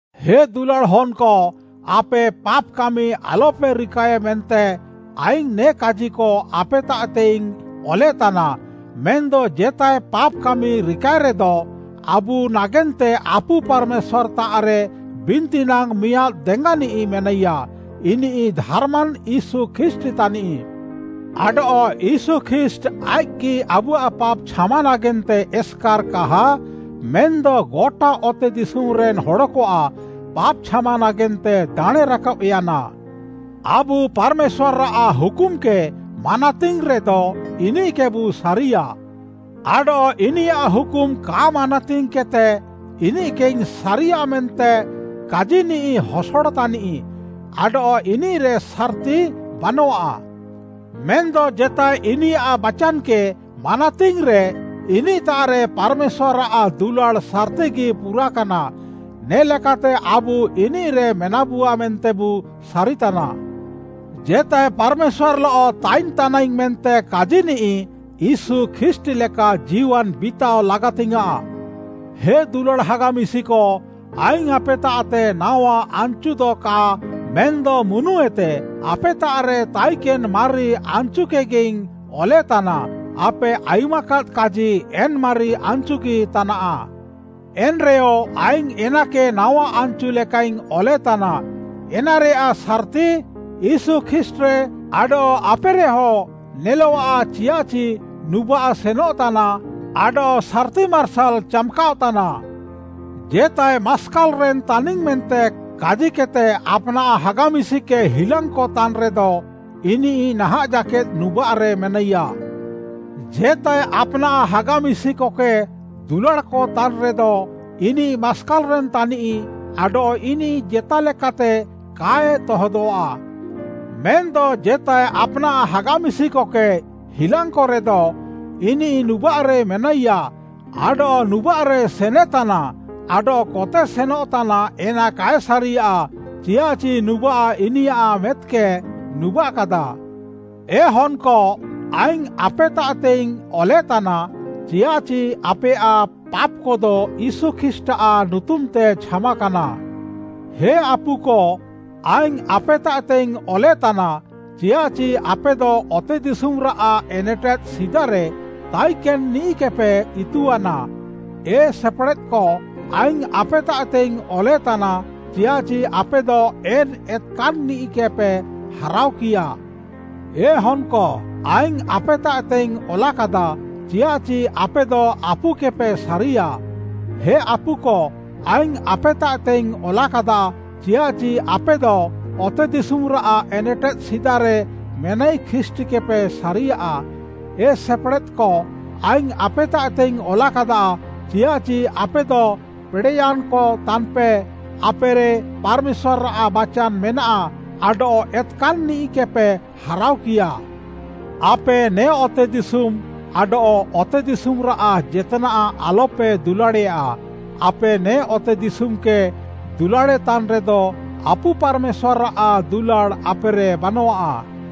ହେ ଦୁଲାଡ଼୍‌ ହନ୍‌କ, ଆପେ ପାପ୍‌ କାମି ଆଲପେ ରିକାଏ ମେନ୍ତେ ଆଇଙ୍ଗ୍‌ ନେ କାଜିକ ଆପେତାଃତେଇଙ୍ଗ୍‌ ଅଲେତାନା। ମେନ୍‌ଦ ଜେତାଏ ପାପ୍‌ କାମି ରିକାଏରେଦ, ଆବୁ ନାଗେନ୍ତେ ଆପୁ ପାର୍‌ମେଶ୍ୱାର୍‌ତାଃରେ ବିନ୍ତି ନାଙ୍ଗ୍‌ ମିଆଁଦ୍‌ ଦେଙ୍ଗାନିଃ ମେନାଇୟା, ଇନିଃ ଧାର୍‌ମାନ୍‌ ୟୀଶୁ ଖ୍ରୀଷ୍ଟ୍‌ ତାନିଃ। ଆଡଃ ୟୀଶୁ ଖ୍ରୀଷ୍ଟ୍‌ ଆଇଃକ୍‌ଗି ଆବୁଆଃ ପାପ୍‌ ଛାମା ନାଗେନ୍ତେ ଏସ୍‌କାର୍‌ କାହା, ମେନ୍‌ଦ ଗଟା ଅତେଦିଶୁମ୍‌ରେନ୍‌ ହଡ଼କଆଃ ପାପ୍‌ ଛାମା ନାଗେନ୍ତେ ଦାଣେଁ ରାକାବ୍‌ୟାନା। ଆବୁ ପାର୍‌ମେଶ୍ୱାର୍‌ଆଃ ହୁକୁମ୍‌କେ ମାନାତିଙ୍ଗ୍‌ରେଦ, ଇନିଃକେବୁ ସାରିୟା। ଆଡଃ ଇନିୟାଃ ହୁକୁମ୍‌ କା ମାନାତିଙ୍ଗ୍‌କେଦ୍‌ତେ, ଇନିଃକେଇଙ୍ଗ୍‌ ସାରିୟା ମେନ୍ତେ କାଜିନିଃ ହସଡ଼ ତାନିଃ ଆଡଃ ଇନିଃରେ ସାର୍‌ତି ବାନଃଆ। ମେନ୍‌ଦ ଜେତାଏ ଇନିୟାଃ ବାଚାନ୍‌କେ ମାନାତିଙ୍ଗ୍‌ରେ, ଇନିଃତାଃରେ ପାର୍‌ମେଶ୍ୱାର୍‌ଆଃ ଦୁଲାଡ଼୍‌ ସାର୍‌ତିଗି ପୁରାକାନା। ନେ'ଲେକାତେ ଆବୁ ଇନିଃରେ ମେନାବୁଆ ମେନ୍ତେବୁ ସାରିତାନା। ଜେତାଏ ପାର୍‌ମେଶ୍ୱାର୍‌ଲଃ ତାଇନ୍‌ ତାନାଇଙ୍ଗ୍‌ ମେନ୍ତେ କାଜିନିଃ, ୟୀଶୁ ଖ୍ରୀଷ୍ଟ୍‌ ଲେକା ଜୀୱାନ୍‌ ବିତାଅ ଲାଗାତିଙ୍ଗ୍‌ୟାଁଃ। ହେ ଦୁଲାଡ଼୍‌ ହାଗା ମିଶିକ, ଆଇଙ୍ଗ୍‌ ଆପେତାଃତେ ନାୱା ଆନ୍‌ଚୁଦ କା ମେନ୍‌ଦ ମୁନୁଏତେ ଆପେତାଃରେ ତାଇକେନ୍‌ ମାରି ଆନ୍‌ଚୁକେଗିଇଙ୍ଗ୍‌ ଅଲେତାନା, ଆପେ ଆୟୁମାକାଦ୍‌ କାଜି, ଏନ୍‌ ମାରି ଆନ୍‌ଚୁଗି ତାନାଃ। ଏନ୍‌ରେୟ, ଆଇଙ୍ଗ୍‌ ଏନାକେ ନାୱା ଆନ୍‌ଚୁ ଲେକାଇଙ୍ଗ୍‌ ଅଲେତାନା, ଏନାରେୟାଃ ସାର୍‌ତି, ୟୀଶୁ ଖ୍ରୀଷ୍ଟ୍‌ରେ ଆଡଃ ଆପେରେହଁ ନେଲଃଆ, ଚିୟାଃଚି ନୁବାଃ ସେନଃତାନା ଆଡଃ ସାର୍‌ତି ମାର୍ସାଲ୍‌ ଚାମ୍‌କାଅଃ ତାନା। ଜେତାଏ ମାସ୍କାଲ୍‌ରେନ୍‌ ତାନିଙ୍ଗ୍‌ ମେନ୍ତେ କାଜିକେଦ୍‌ତେ, ଆପ୍‌ନାଃ ହାଗା ମିଶିକକେ ହିଲାଙ୍ଗ୍‌କ ତାନ୍‌ରେଦ ଇନିଃ ନାହାଁଃ ଜାକେଦ୍‌ ନୁବାଃରେ ମେନାଇୟା। ଜେତାଏ ଆପ୍‌ନାଃ ହାଗା ମିଶିକକେ ଦୁଲାଡ଼୍‌କ ତାନ୍‌ରେଦ, ଇନିଃ ମାସ୍କାଲ୍‌ରେନ୍‌ ତାନିଃ ଆଡଃ ଇନିଃ ଜେତାଲେକାତେ କାଏ ତହଦଃଆ। ମେନ୍‌ଦ ଜେତାଏ ଆପ୍‌ନାଃ ହାଗା ମିଶିକକେ ହିଲାଙ୍ଗ୍‌କରେଦ, ଇନିଃ ନୁବାଃରେ ମେନାଇୟା, ଆଡଃ ନୁବାଃରେ ସେନେତାନା ଆଡଃ କତେ ସେନଃତାନା ଏନା କାଏ ସାରିୟା ଚିୟାଃଚି ନୁବାଃ ଇନିୟାଃ ମେଦ୍‌କେ ନୁବାଃକାଦା। ଏ ହନ୍‌କ, ଆଇଙ୍ଗ୍‌ ଆପେତାଃତେଇଙ୍ଗ୍‌ ଅଲେତାନା, ଚିୟାଃଚି ଆପେୟାଃ ପାପ୍‌କଦ ୟୀଶୁ ଖ୍ରୀଷ୍ଟ୍‌ଆଃ ନୁତୁମ୍‌ତେ ଛାମାକାନା। ହେ ଆପୁକ, ଆଇଙ୍ଗ୍‌ ଆପେତାଃତେଇଙ୍ଗ୍‌ ଅଲେତାନା, ଚିୟାଃଚି ଆପେଦ ଅତେଦିଶୁମ୍‌ରାଃ ଏନେଟେଦ୍‌ ସିଦାରେ ତାଇକେନ୍‌ନିଃକେପେ ଇତୁଆନା। ଏ ସେପେଡ଼େଦ୍‌କ, ଆଇଙ୍ଗ୍‌ ଆପେତାଃତେଇଙ୍ଗ୍‌ ଅଲେତାନା, ଚିୟାଃଚି ଆପେଦ ଏନ୍‌ ଏତ୍‌କାନ୍‌ନିଃକେପେ ହାରାଅକିୟା। ଏ ହନ୍‌କ, ଆଇଙ୍ଗ୍‌ ଆପେତାଃତେଇଙ୍ଗ୍‌ ଅଲାକାଦା, ଚିୟାଃଚି ଆପେଦ ଆପୁକେପେ ସାରିୟା। ହେ ଆପୁକ, ଆଇଙ୍ଗ୍‌ ଆପେତାଃତେଇଙ୍ଗ୍‌ ଅଲାକାଦା, ଚିୟାଃଚି ଆପେଦ ଅତେଦିଶୁମ୍‌ରାଃ ଏନେଟେଦ୍‌ ସିଦାରେ ମେନାଇ ଖ୍ରୀଷ୍ଟ୍‌କେପେ ସାରିୟା। ଏ ସେପେଡ଼େଦ୍‌କ, ଆଇଙ୍ଗ୍‌ ଆପେତାଃତେଇଙ୍ଗ୍‌ ଅଲାକାଦା, ଚିୟାଃଚି ଆପେଦ ପେଡ଼େୟାନ୍‌କ ତାନ୍‌ପେ, ଆପେରେ ପାର୍‌ମେଶ୍ୱାର୍‌ଆଃ ବାଚାନ୍‌ ମେନାଃ ଆଡଃ ଏତ୍‌କାନ୍‌ନିଃକେପେ ହାରାଅକିୟା। ଆପେ ନେ ଅତେଦିଶୁମ୍‌ ଆଡଃ ଅତେଦିଶୁମ୍‌ରାଃ ଜେତ୍‌ନାଃ ଆଲ୍‌ପେ ଦୁଲାଡ଼େୟା। ଆପେ ନେ ଅତେଦିଶୁମ୍‌କେ ଦୁଲାଡ଼େତାନ୍‌ରେଦ, ଆପୁ ପାର୍‌ମେଶ୍ୱାର୍‌ଆଃ ଦୁଲାଡ଼୍‌ ଆପେରେ ବାନଃଆ।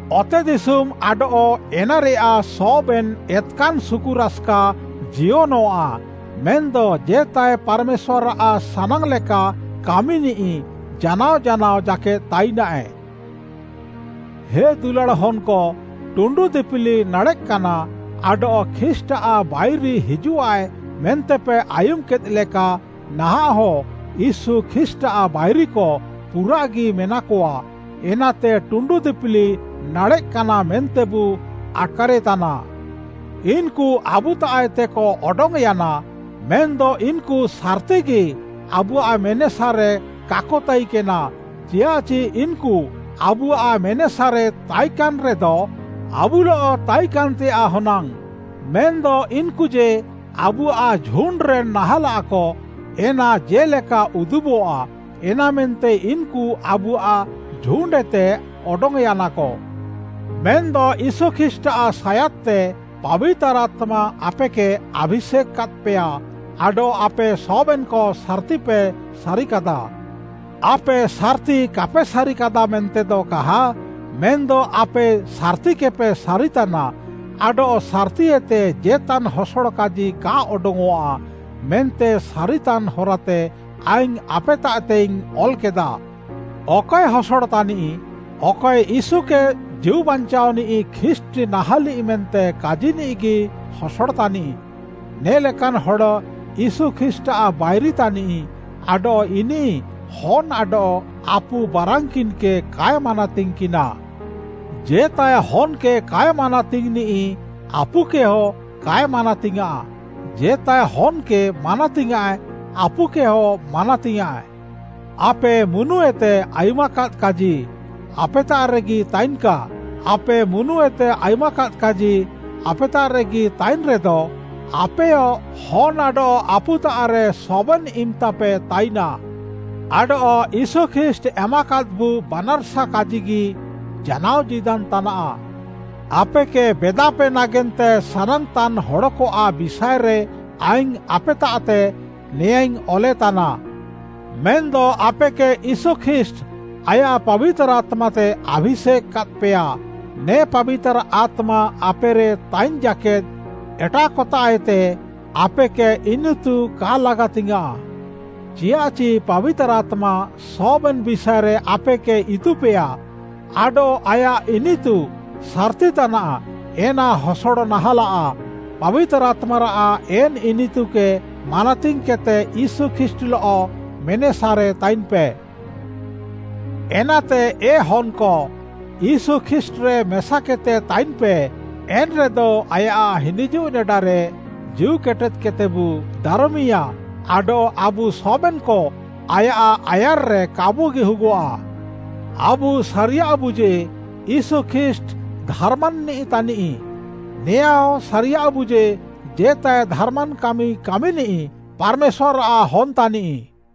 ଅତେଦିଶୁମ୍‌ ଆଡଃ ଏନାରେୟାଃ ସବେନ୍‌ ଏତ୍‌କାନ୍‌ ସୁକୁରାସ୍‌କା ଜିୟନଃଆ, ମେନ୍‌ଦ ଜେତାଏ ପାର୍‌ମେଶ୍ୱାର୍‌ଆଃ ସାନାଙ୍ଗ୍‌ ଲେକା କାମିନିଃ ଜାନାଅ ଜାନାଅ ଜାକେଦ୍‌ ତାଇନାଏ। ହେ ଦୁଲାଡ଼୍‌ ହନ୍‌କ, ଟୁଣ୍ଡୁ ଦିପିଲି ନାଡ଼େଃକାନା, ଆଡଃ ଖ୍ରୀଷ୍ଟ୍‌ଆଃ ବାଇରି ହିଜୁଃଆଏ ମେନ୍ତେପେ ଆୟୁମ୍‌କେଦ୍‌ଲେକା ନାହାଁଃହ ୟୀଶୁ ଖ୍ରୀଷ୍ଟ୍‌ଆଃ ବାଇରିକ ପୁରାଃଗି ମେନାକଆ, ଏନାତେ ଟୁଣ୍ଡୁ ଦିପିଲି ନାଡ଼େଃକାନା ମେନ୍ତେବୁ ଆଟ୍‌କାରେତାନା। ଇନ୍‌କୁ ଆବୁତାଃଏତେକ ଅଡଙ୍ଗ୍‌ୟାନା ମେନ୍‌ଦ ଇନ୍‌କୁ ସାର୍‌ତିଗି ଆବୁଆଃ ମେନେସାରେ କାକ ତାଇକେନା, ଚିୟାଃଚି ଇନ୍‌କୁ ଆବୁଆଃ ମେନେସାରେ ତାଇକାନ୍‌ରେଦ ଆବୁଲଃକ ତାଇକାନ୍‌ତେୟାଃ ହନାଙ୍ଗ୍‌ଆଃ। ମେନ୍‌ଦ ଇନ୍‌କୁ ଯେ, ଆବୁଆଃ ଝୁଣ୍ଡ୍‌ରେନ୍‌ ନାହାଁଲାକ, ଏନା ଜେ'ଲେକା ଉଦୁବଃଆ, ଏନାମେନ୍ତେ ଇନ୍‌କୁ ଆବୁଆଃ ଝୁଣ୍ଡ୍‌ଏତେ ଅଡଙ୍ଗ୍‌ୟାନାକ। ମେନ୍‌ଦ ୟୀଶୁ ଖ୍ରୀଷ୍ଟ୍‌ଆଃ ସାୟାଦ୍‌ତେ ପାବିତାର୍‌ ଆତ୍ମା ଆପେକେ ଆଭିଷେକ୍‌ କାଦ୍‌ପେୟା, ଆଡଃ ଆପେ ସବେନ୍‌କ ସାର୍‌ତିପେ ସାରିକାଦା। ଆପେ ସାର୍‌ତି କାପେ ସାରିକାଦା ମେନ୍ତେଦ କାହା, ମେନ୍‌ଦ ଆପେ ସାର୍‌ତିକେପେ ସାରିତାନା, ଆଡଃ ସାର୍‌ତିଏତେ ଜେତାନ୍‌ ହସଡ଼ କାଜି କା ଅଡଙ୍ଗ୍‌ଅଃଆ ମେନ୍ତେ ସାରିତାନ୍‌ ହରାତେ ଆଇଙ୍ଗ୍‌ ଆପେତାଃତେଇଙ୍ଗ୍‌ ଅଲ୍‌କେଦା। ଅକଏ ହସଡ଼ ତାନିଃ? ଅକଏ ୟୀଶୁକେ ଜୀଉବାଞ୍ଚାଅନିଃ ଖ୍ରୀଷ୍ଟ୍‌ ନାହାଁଲିଃ ମେନ୍ତେ କାଜିନିଃଗି ହସଡ଼ ତାନିଃ। ନେ ଲେକାନ୍‌ ହଡ଼ ୟୀଶୁ ଖ୍ରୀଷ୍ଟ୍‌ଆଃ ବାଇରି ତାନିଃ ଆଡଃ ଇନିଃ ହନ୍‌ ଆଡଃ ଆପୁ ବାରାନ୍‌କିନ୍‌କେ କାଏ ମାନାତିଙ୍ଗ୍‌କିନା। ଜେତାଏ ହନ୍‌କେ କାଏ ମାନାତିଙ୍ଗ୍‌ନିଃ ଆପୁକେହ କାଏ ମାନାତିୟାଁଃ, ଜେତାଏ ହନ୍‌କେ ମାନାତିୟାଁଃ ଆପୁକେହ ମାନାତିୟାଁଃ। ଆପେ ମୁନୁଏତେ ଆୟୁମାକାଦ୍‌ କାଜି, ଆପେତାଃରେଗି ତାଇନ୍‌କା। ଆପେ ମୁନୁଏତେ ଆୟୁମାକାଦ୍‌ କାଜି, ଆପେତାଃରେଗି ତାଇନ୍‌ରେଦ, ଆପେୟ ହନ୍‌ ଆଡଃ ଆପୁତାଃରେ ସବେନ୍‌ ଇମ୍‌ତାପେ ତାଇନା। ଆଡଃ ୟୀଶୁ ଖ୍ରୀଷ୍ଟ୍‌ ଏମାକାଦ୍‌ବୁ ବାନାର୍‌ସା କାଜିଗି ଜାନାଅ ଜୀଦାନ୍‌ ତାନାଃ। ଆପେକେ ବେଦାପେ ନାଗେନ୍ତେ ସାନାଙ୍ଗ୍‌ତାନ୍‌ ହଡ଼କଆଃ ବିଷାଏରେ ଆଇଙ୍ଗ୍‌ ଆପେତାଃତେ ନେଆଁଁଇଙ୍ଗ୍‌ ଅଲେତାନା। ମେନ୍‌ଦ ଆପେକେ ୟୀଶୁ ଖ୍ରୀଷ୍ଟ୍‌ ଆୟାଃ ପାବିତାର୍‌ ଆତ୍ମାତେ ଆଭିଷେକ୍‌ କାଦ୍‌ପେୟା। ନେ ପାବିତାର୍‌ ଆତ୍ମା ଆପେରେ ତାଇନ୍‌ ଜାକେଦ୍‌ ଏଟାଃକତାଃଏତେ ଆପେକେ ଇନିତୁ କା ଲାଗାତିଙ୍ଗ୍‌ୟାଁଃ। ଚିୟାଃଚି ପାବିତାର୍‌ ଆତ୍ମା ସବେନ୍‌ ବିଷାଏରେ ଆପେକେ ଇତୁପେୟା ଆଡଃ ଆୟାଃ ଇନିତୁ ସାର୍‌ତି ତାନାଃ ଏନା ହସଡ଼ ନାହାଁଲାଃ। ପାବିତାର୍‌ ଆତ୍ମାରାଃ ଏନ୍‌ ଇନିତୁକେ ମାନାତିଙ୍ଗ୍‌କେଦ୍‌ତେ ୟୀଶୁ ଖ୍ରୀଷ୍ଟ୍‌ଲଃ ମେନେସାରେ ତାଇନ୍‌ପେ। ଏନାତେ ଏ ହନ୍‌କ, ୟୀଶୁ ଖ୍ରୀଷ୍ଟ୍‌ରେ ମେସାକେଦ୍‌ତେ ତାଇନ୍‌ପେ, ଏନ୍‌ରେଦ ଆୟାଃ ହିନିଜୁଃ ନେଡାରେ ଜୀଉ କେଟେଦ୍‌କେଦ୍‌ତେବୁ ଦାରମିୟାଁ ଆଡଃ ଆବୁ ସବେନ୍‌କ ଆୟାଃ ଆୟାର୍‌ରେ କାବୁ ଗିହୁଗଃଆ। ଆବୁ ସାରିୟାଃବୁ ଯେ, ୟୀଶୁ ଖ୍ରୀଷ୍ଟ୍‌ ଧାର୍‌ମାନ୍‌ନିଃ ତାନିଃ, ନେଆଁହଁ ସାରିୟାଃବୁ ଯେ, ଜେତାଏ ଧାର୍‌ମାନ୍‌ କାମି କାମିନିଃ ପାର୍‌ମେଶ୍ୱାର୍‌ଆଃ ହନ୍‌ ତାନିଃ।